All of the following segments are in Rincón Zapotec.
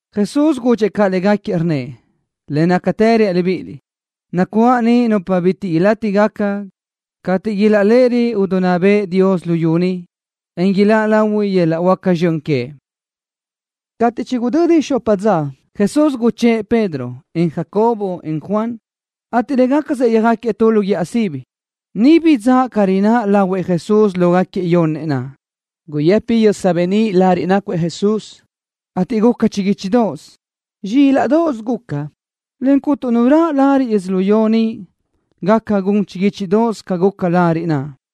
Jesús gudxëʼ caʼ légaquiëʼ, rnnëʼ: —Le nácatë reaʼ libíʼiliʼ, nacuáʼ ni nupa bitiʼ ilátigaca cateʼ ilaʼléʼerö idinná bëʼë Dios luyú ni, en iláʼ lahui yöl-laʼ huáca zxön queëʼ. Cateʼ chigudödi xopa dza, Jesús guchë́ʼë Pedro, en Jacobo, en Juan, ateʼ légacasëʼ yöjáquiëʼ tu lu guíʼa sibi. Niʼ bidzáʼa ca rináʼ lahuëʼ Jesús lógaquiëʼ yonnëʼ naʼ. Guyëpi yösa beníʼ lariʼ nácuëʼ Jesús, ateʼ guca chiguíchidoʼos. Zxílaʼdoʼos guca, le cuntu nu raʼ lariʼ yödzölió ni gaca gun chiguíchidoʼos ca guca lariʼ naʼ.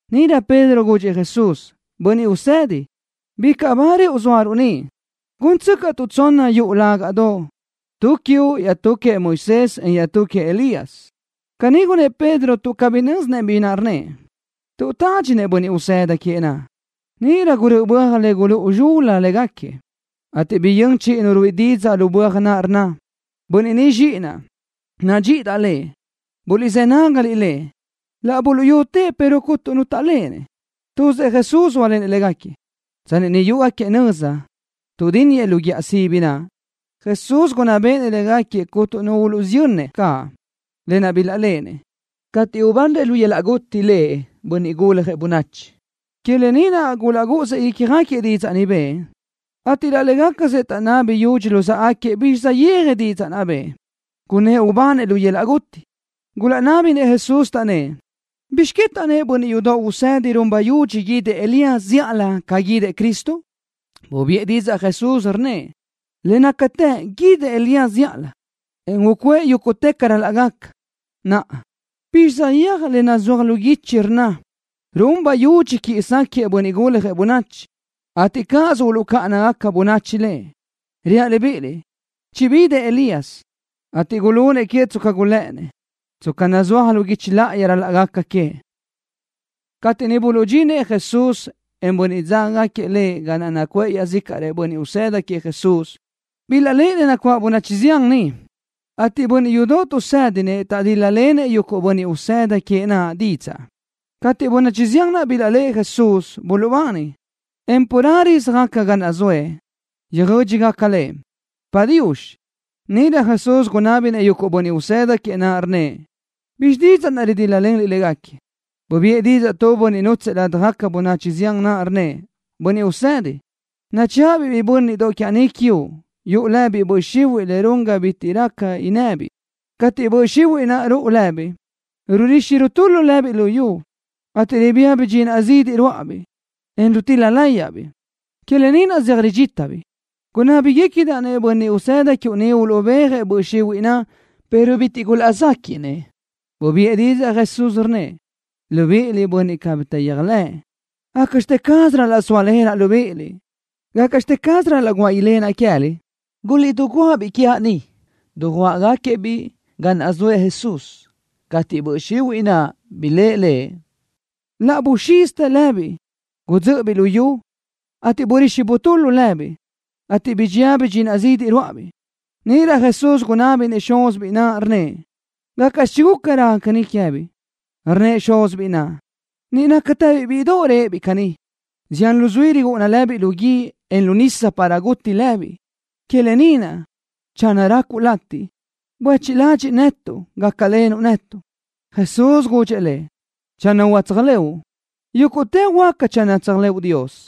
Níʼirö Pedro gudxëʼ Jesús: —Bönniʼ Usedi, bicaʼ ba rëʼu zóaruʼ ni. Gúntsöcaʼtuʼ tsonna yuʼu lágaʼdoʼ, tu quiuʼ, iaʼtú queëʼ Moisés, en iaʼtú queëʼ Elías. Caní gunnë́ʼ Pedro tuʼ cabí nö́zinëʼ bi naʼ rnnëʼ, tuʼ tádxinëʼ bönniʼ usëda queëʼ Jesús naʼ. Níʼirö gurö́ʼö böaj le gulúʼu zxul-la légaquiëʼ, ateʼ biyö́n chiʼi nu ruíʼi didzaʼ lu böaj naʼ, rnna: —Bönniʼ ni Zxíʼinaʼ. Nadxíʼidaʼ Lëʼ. Buliʼzë́ nágaliʼ Lëʼ. Laʼ buluʼyutëʼ pero cúnturö nu taʼléʼenëʼ. Tuzëʼ Jesús zóalenëʼ légaquiëʼ. Tsanni niʼ yúʼugaquiëʼ nöza, tuʼdínniëʼ lu guíʼa sibi naʼ, Jesús gunná béʼenëʼ légaquiëʼ cuntu nu uluʼsiyönnëʼ caʼ, lë naʼ bilaʼléʼenëʼ, cateʼ ubanrëʼ lu yöl-laʼ guti Lëʼ, Bönniʼ Guljëʼ Bönachi. Que lë ni naʼ gulaʼgúʼusëʼ ícjagaquiëʼ didzaʼ ni bëʼë, ateʼ laʼ légacasëʼ taʼnabi yúdxinëʼ luzáʼagaquiëʼ bizxi saʼyéaj didzaʼ naʼ bëʼë, gunnë́ʼ ubanëʼ lu yöl-laʼ guti. Gulaʼnábinëʼ Jesús, taʼnnë́ʼ: —¿Bizx que taʼnnë́ʼ bönniʼ yudoʼ usedi run bayudxi guídëʼ Elías zíʼalö ca guídëʼ Cristo? Bubiʼë didzaʼ Jesús, rnnëʼ: —Le nácatë guídëʼ Elías zíʼalö, en ucuʼë yúguʼtë ca ral-laʼ gaca. Naʼa, ¿bizxi saʼyéaj le nazúaj lu guichi rnna run bayudxi quiʼi sáquëʼë Bönniʼ Guljëʼ Bönachi, ateʼ cáʼasö uluʼcáʼana bönachi Lëʼ? Reaʼ libíʼiliʼ: Chibidëʼ Elías, ateʼ gulunëʼ queëʼ tsca gulë́ʼënnëʼ, tsca nazúaj lu guichi láʼayi ca ral-laʼ gaca queëʼ. Cateʼ niʼ buluʼdxinëʼ Jesús, en bönniʼ dzágagaquiëʼ Lëʼ ga naʼ nacuʼë iaʼzícaʼrëʼ bönniʼ usëda queëʼ Jesús, bilaʼléʼenëʼ nacuáʼ bönachi zián niʼ, ateʼ bönniʼ yudoʼ tuʼsë́dinëʼ taʼdíl-lalenëʼ yuguʼ bönniʼ usëda queëʼ naʼ didzaʼ. Cateʼ bönachi zián naʼ bilaʼléʼe Jesús, buluʼbani, en carelö záʼgaca ga naʼ zëʼë, dijö́dxigaca Lëʼ: “Padiux.” Níʼirö Jesús gunábinëʼ yuguʼ bönniʼ usëda queëʼ naʼ, rnnëʼ: —¿Bizxi didzaʼ naʼ ridíl-lalenliʼ légaquiëʼ? Bubiʼë didzaʼ tu bönniʼ nútsëʼë ladaj bönachi zián naʼ, rnnëʼ: —Bönniʼ Usedi, nachëʼa-biʼ biʼi bö́nniʼdoʼ quiaʼ ni quiuʼ, yuʼu lëbiʼ böʼ xihuiʼ le run ga bitiʼ raca innëbiʼ. Cateʼ böʼ xihuiʼ naʼ ruʼu lëbiʼ, rurixi rutula lëbiʼ lu yu, ateʼ ribía bidxinaʼ zidiʼ ruáʼabiʼ, en rutil-la láyaʼbiʼ. Que lë ni naʼ zeaj ridxítabiʼ. Gunábigacadaʼ-nëʼ bönniʼ usëda quiuʼ uluʼbéajëʼ böʼ xihuiʼ naʼ, pero bitiʼ gulaʼzéquiʼnëʼ. Bubiʼë didzaʼ Jesús, rnnëʼ: —Libiʼiliʼ, bönniʼ cabí taʼyéajlëʼë. ¿Gácaʼxte caz ral-laʼ sóalenaʼ libíʼiliʼ? ¿Gácaʼxte caz ral-laʼ guáʼ ilenaʼ queë́liʼ? Guliʼdiguáʼ-biʼ quiaʼ ni. Dujuáʼagaquiëʼ-biʼ ga naʼ zoëʼ Jesús. Cateʼ böʼ xihuiʼ naʼ biléʼe Lëʼ, laʼ buxízitë lëbiʼ. Gudzö́ʼöbiʼ lu yu, ateʼ burixi butula lëbiʼ, ateʼ bidxía bidxinaʼ zidiʼ ruáʼabiʼ. Níʼirö Jesús gunábinëʼ xúzibiʼ biʼi naʼ, rnnëʼ: —¿Gácaʼxi chiguca raca caní queë́biʼ? Rnnëʼ xúzibiʼ naʼ: —Niʼ nácatëbiʼ bíʼidoʼ réʼebiʼ caní. Zián luzuí rirúʼuna lëbiʼ lu guíʼ, en lu nisa para guti lëbiʼ. Que lë ni naʼ, channö racuʼ latiʼ, buéchiʼ ladxiʼ netuʼ, gácalenuʼ netuʼ. Jesús gudxëʼ lëʼ: —Channö huáca tséajlëʼu, yúguʼtë huáca channö tséajlëʼu Dios.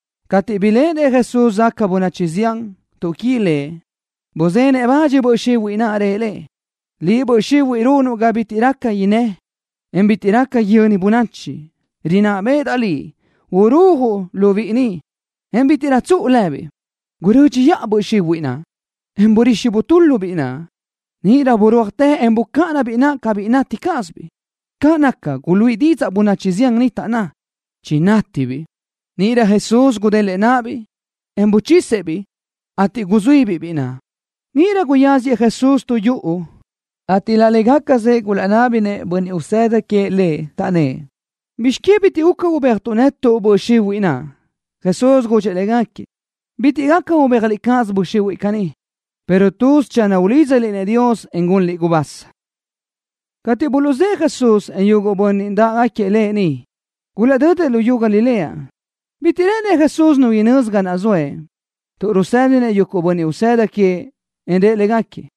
Cateʼ biléʼenëʼ Jesús záʼgaca bönachi zián, tuʼquí Lëʼ, buzenëʼ bach böʼ xihuiʼ naʼ, rëʼ le: —Liʼ, böʼ xihuiʼ runuʼ ga bitiʼ raca inná, en bitiʼ raca yöni bönachi, rinná béʼedaʼ liʼ urujuʼ lu biʼi ni, en bítiʼrö tsuʼu lëbiʼ. Gurö́dxiʼa böʼ xihuiʼ naʼ, en burixi butúladaʼ biʼi naʼ. Níʼirö burúajtë, en bucáʼana biʼi naʼ ca biʼi nati cázabiʼ. Caʼ naca, guluíʼi didzaʼ bönachi zián niʼ, taʼnná: —Chinátibiʼ. Níʼirö Jesús gudélëʼë náʼabiʼ, en buchisëʼ-biʼ, ateʼ guzuíbiʼ biʼi naʼ. Níʼirö guyáziëʼ Jesús tu yuʼu, ateʼ laʼ légacasëʼ gulaʼnábinëʼ bönniʼ usëda queëʼ Lëʼ, taʼnnë́ʼ: —¿Bizx que bitiʼ guca ubéajtuʼ netuʼ böʼ xihuiʼ naʼ? Jesús gudxëʼ légaquiëʼ: —Bitiʼ gaca ubéajliʼ cáʼasö böʼ xihuiʼ caní, pero tuz channö ulídzaliʼ-nëʼ Dios, en gunliʼ gubasa. Cateʼ buluʼzë́ʼë Jesús, en yuguʼ bönniʼ dáʼgaquiëʼ Lëʼ niʼ, gulaʼdödëʼ luyú Galilea. Bitiʼ rë́ʼënëʼ Jesús nu inözi ga naʼ zoëʼ tuʼ rusë́dinëʼ yuguʼ bönniʼ usëda queëʼ. Rëʼ légaquiëʼ: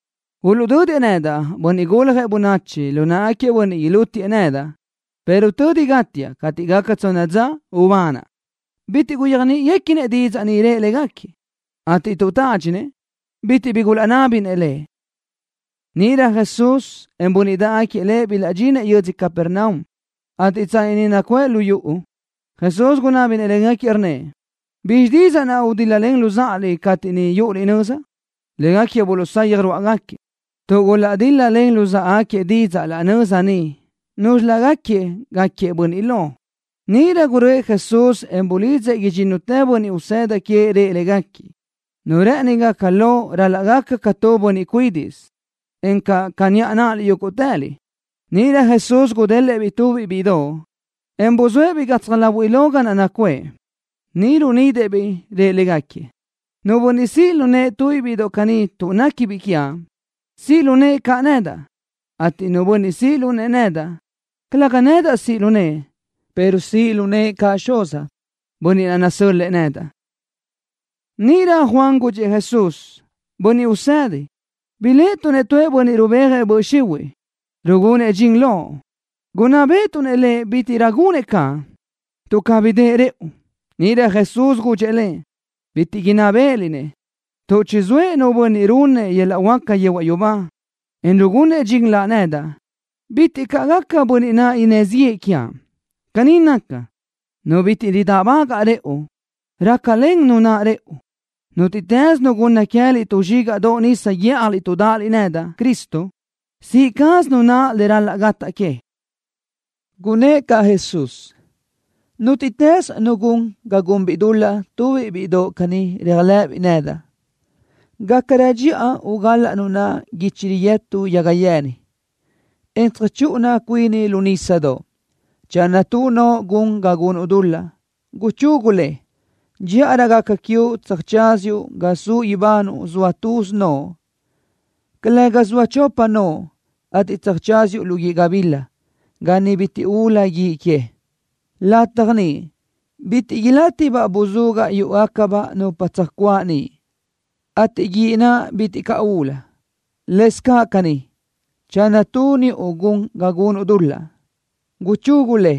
—Uluʼdödëʼ nedaʼ, Bönniʼ Guljëʼ Bönachi, lu náʼagaquiëʼ bönniʼ ilútiëʼ nedaʼ, pero tödi gátiaʼ, cateʼ gaca tsonna dza ubanaʼ. Bitiʼ gulaʼyéajniʼinëʼ didzaʼ ni rëʼ légaquiëʼ, ateʼ tuʼ tádxinëʼ, bitiʼ bi gulaʼnábinëʼ Lëʼ. Níʼirö Jesús, en bönniʼ dáʼgaquiëʼ Lëʼ bilaʼdxinëʼ yödzö Capernaum, ateʼ tsanni niʼ nacuʼë lu yuʼu, Jesús gunábinëʼ légaquiëʼ, rnnëʼ: —¿Bizxi didzaʼ naʼ gudíl-lalen luzáʼaliʼ cateʼ niʼ yúʼuliʼ nöza? Légaquiëʼ buluʼsayaj rúʼugaquiëʼ, tuʼ gulaʼdíl-lalen luzáʼagaquiëʼ didzaʼ laʼ nöza niʼ núzxilögaquiëʼ gáquiëʼ bönniʼ lo. Níʼirö guröʼë Jesús, en bulidzëʼ idxínnutëʼ bönniʼ usëda queëʼ. Rëʼ légaquiëʼ: —Nu rë́ʼëni gaca lo ral-laʼ gaca ca tu bönniʼ cuídiʼsö, encaʼ ca niʼa náʼaliʼ yúguʼtëliʼ. Níʼirö Jesús gudélëʼë-biʼ tubiʼ bíʼidoʼ, en buzóëʼ-biʼ gatsaj láhuiʼlö ga naʼ nacuʼë. Niʼ runidëʼ-biʼ, rëʼ légaquiëʼ: —Nu bönniʼ siʼ lu nëʼë tu bíʼidoʼ caní tuʼ néquibiʼ quiaʼ, siʼ lu nëʼë caʼ nedaʼ, ateʼ nu bönniʼ siʼ lu nëʼë nedaʼ, calëga nédaʼsö siʼ lu nëʼë, pero siʼ lu nëʼë caʼ Xuzaʼ, Bönniʼ naʼ nasö́l-lëʼë nedaʼ. Níʼirö Juan gudxëʼ Jesús: —Bönniʼ Usedi, biléʼetuʼ-nëʼ tu bönniʼ rubéajëʼ yuguʼ böʼ xihuiʼ, rugunëʼ dxin loʼ. Gunná béʼetuʼ lëʼ bítiʼrö gunëʼ caʼ, tuʼ cabí dëʼë rëʼu. Níʼirö Jesús gudxëʼ lëʼ: —Bitiʼ inná béʼeliʼ-nëʼ, tuʼ channö zoëʼ nu bönniʼ runëʼ tu yöl-laʼ huáca le zaʼ yehuaʼ yubá, en rugunëʼ dxin Laʼ nedaʼ, bitiʼ caʼ gaca bönniʼ naʼ innë́ ziʼë quiaʼ. Caní naca, nu bitiʼ ridáʼbagaʼ rëʼu, rácalen nu naʼ rëʼu. Nútiʼtës nu gunna queë́liʼ tu zxígaʼdoʼ nisa guíʼjaliʼ tuʼ dáʼaliʼ nedaʼ, Cristo, siʼi caz nu naʼ le ral-laʼ gataʼ que. Gunnë́ʼ caʼ Jesús: —Nútiʼtës nu gun ga gunbiʼ dul-laʼ tubiʼ bíʼidoʼ caní réajlëʼëbiʼ nedaʼ, gácarö dxiʼa ugal-laʼ nu naʼ guichi riyëtu yaga yeni, en tsöjchúʼuna cuini lu nísadoʼ. Channö tu noʼo gun ga gunuʼ dul-laʼ, guchugu le. Dxíʼarö gaca quiuʼ tsöjtsáziuʼ ga suʼ ibanuʼ zoa tuz noʼo, calëga zoa chopa noʼo, ateʼ tsöjtsáziuʼ lu guíʼ gabila, ga niʼ bitiʼ ulu guíʼ que. Lataj niʼ bitiʼ ilátibaʼ buzugaʼ yúʼugacabaʼ nupa tsöjcuáʼ niʼ, ateʼ guíʼ naʼ bitiʼ caʼ ulu. Lëscaʼ caní, channö tu niʼu gun ga gunuʼ dul-laʼ, guchugu le.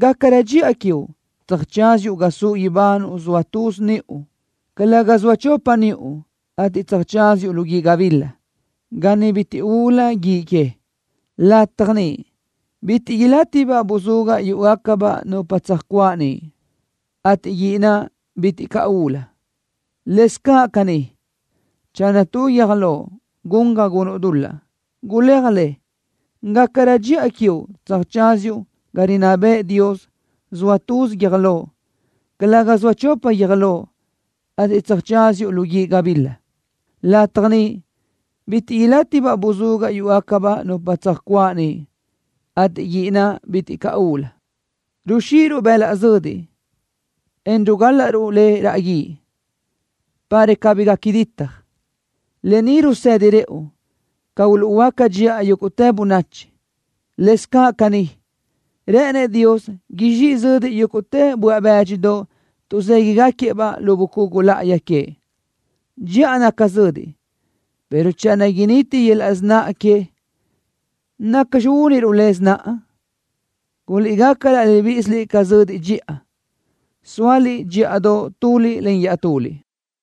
Gácarö dxiʼa quiuʼ, tsöjtsáziuʼ ga suʼ ibanuʼ zoa tuz niʼu, calëga zoa chopa niʼu, ateʼ tsöjtsáziuʼ lu guíʼ gabila, ga niʼ bitiʼ ulu guíʼ que. Lataj niʼ bitiʼ ilátibaʼ buzugaʼ yúʼugacabaʼ nupa tsöjcuáʼ niʼ, ateʼ guíʼ naʼ bitiʼ caʼ ulu. Lëscaʼ caní, channö tu guiö́j loʼ gun ga gunuʼ dul-laʼ, guléaj le. Gácarö dxiʼa quiuʼ tsöjtsáziuʼ ga rinná bëʼë Dios zoa tuz guiö́j loʼ, calëga zoa chopa guiö́j loʼ, ateʼ tsöjtsáziuʼ lu guíʼ gabila. Lataj niʼ bitiʼ ilátibaʼ buzugaʼ yúʼugacabaʼ nupa tsöjcuáʼ niʼ, ateʼ guíʼ naʼ bitiʼ caʼ ulu. ’Ruxiʼiruʼ bëlaʼ zödiʼ, en rugálaʼruʼ le raʼ guíʼ, para cabí gaca ditaj. Lë ni rusedi rëʼu ca uluʼhuöáca dxiʼa yúguʼtë bönachi. Lëscaʼ caní, rë́ʼënëʼ Dios izxíʼi zödiʼ yúguʼtë böaʼ bë́dxidoʼ tuʼzéguiʼgaquiëʼ-baʼ lu bucugu láʼayi queëʼ. Dxiʼa naca zödiʼ, pero channö initi yöl-laʼ sináʼa que, ¿nacxi úniruʼ le sináʼa? Guliʼgaca laʼ libíʼisiliʼ ca zödiʼ dxiʼa, sóaliʼ dxíʼadoʼ tuliʼ len iaʼtuliʼ.